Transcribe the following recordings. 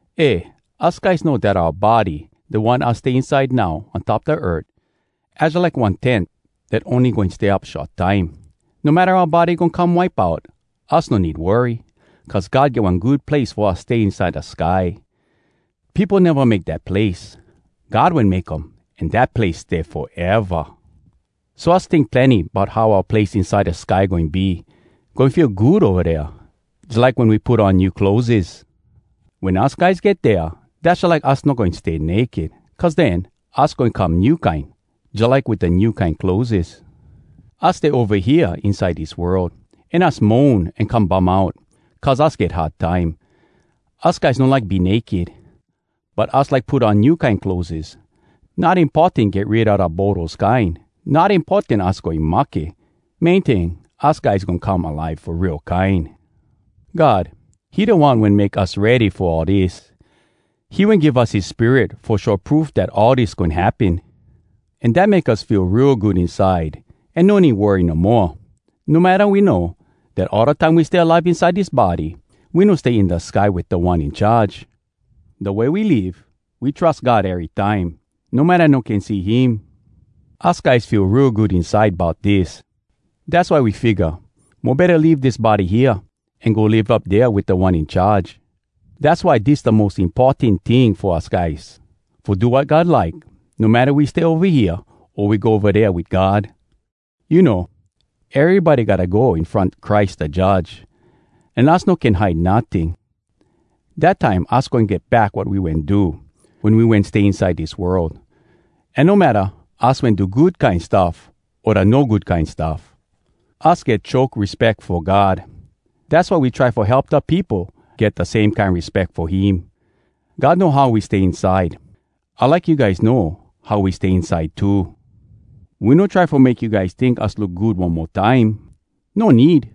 Eh, us guys know dat oua body, da one us stay inside now on top da earth, az jalike one tent dat ony goin stay up short time. No matta oua body goin come wipe out, us no need worry. Cuz God get one good place fo us stay inside da sky. Peopo neva make dat place. God wen make um an dat place stay foeva! So us tink plenny bout how oua place inside da sky goin be. Goin feel good ova dea, jalike wen we put on new clotheses. Wen us guys get dea, dass jalike us no goin stay naked. Cuz den, us goin come new kine, jalike wit da new kine clotheses. Us stay ova hea inside dis world, an us moan an come bum out, cuz us get hard time. Us guys no like be naked, but us like put on new kine clotheses—not importan get rid a da boros kine. Not importan us goin mahke. Main ting, us guys goin come alive fo real kine! God, he da One wen make us ready fo all dis. He wen give us his Spirit fo show proof dat all dis goin happen. An dat make us feel real good inside an no need worry no moa. No matta we know dat all da time we stay alive inside dis body, we no stay in da sky wit Da One In Charge. Da way we live, we trus God erytime, no matta no can see him. Us guys feel real good inside bout dis. Dass why we figga, mo betta leave dis body hea, an go live up dea wit Da One In Charge. Dass why dis da mos importan ting fo us guys: fo do wat God like, no matta we stay ova hea, o we go ova dea wit God. You know, erybody gotta go in front Christ da Judge, an us no can hide notting. Dat time us goin get back wat we wen do, wen we wen stay inside dis world. An no matta us wen do da good kine stuff o da no good kine stuff. Us get choke respeck fo God. Dass why we try fo help da peopo get da same kine respeck fo him. God know how we stay inside. I like you guys know how we stay inside too. We no try fo make you guys tink us look good one mo time. No need!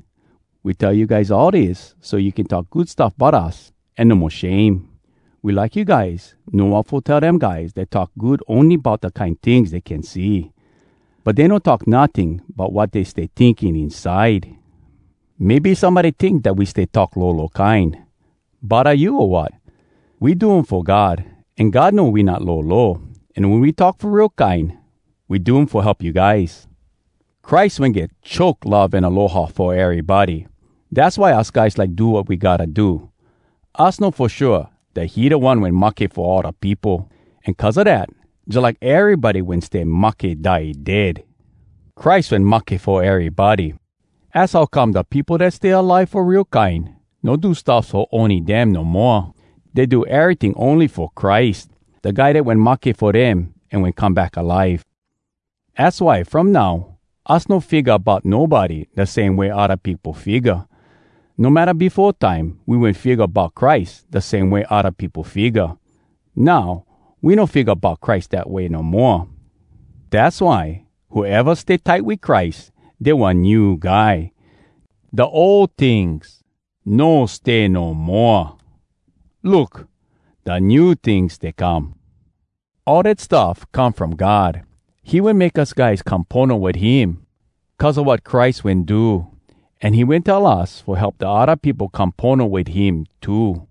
We tell you guys all dis so you can talk good stuff bout us an no mo shame. We like you guys know wat fo tell dem guys dat talk good ony bout da kine tings dey can see. But dey no talk notting bout wat dey stay tinking inside! Maybe somebody tink dat we stay talk lolo kine. Bodda you, o wat? We do um fo God, an God know we not lolo! An wen we talk fo real kine, we do um fo help you guys. Christ wen get choke love an aloha fo erybody. Dass why us guys like do wat we gotta do. Us know fo shua dat he da One wen mahke fo all da peopo. An cuz a dat, jalike erybody wen stay mahke die dead! Christ wen mahke fo erybody. Az how come da peopo dat stay alive fo real kine no do stuffs fo ony dem no moa. Dey do eryting ony fo Christ, da Guy dat wen mahke fo dem an wen come back alive. Az why from now, us no figga bout nobody da same way odda peopo figga. No matta befo time we wen figga bout Christ da same way odda peopo figga. Now, we no figga bout Christ dat way no moa. Dass why, whoeva stay tight wit Christ, dey one new guy. Da ol tings no stay no moa! Look! Da new tings stay come! All dat stuff come from God. He wen make us guys come pono wit him cuz a wat Christ wen do. An he wen tell us fo help da odda peopo come pono wit him too.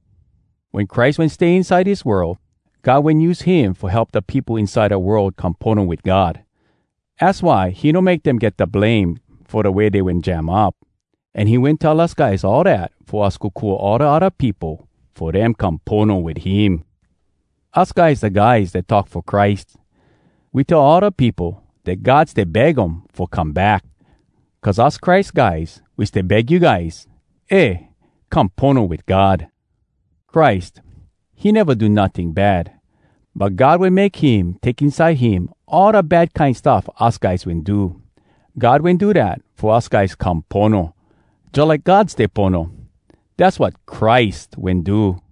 Wen Christ wen stay inside dis world, God wen use him fo help da peopo inside da world come pono wit God. Az why he no make dem get da blame fo da way dey wen jam up. An he wen tell us guys all dat fo us kokua all da odda peopo fo dem come pono wit him. Us guys da guys dat talk fo Christ. We tell all da peopo dat God stay beg um fo come back. Cuz us Christ guys, we stay beg you guys, “Eh, come pono wit God.” Christ, he neva do notting bad, but God wen make him take inside him all da bad kine stuff us guys wen do. God wen do dat fo us guys come pono, jalike God stay pono. Dass wat Christ wen do.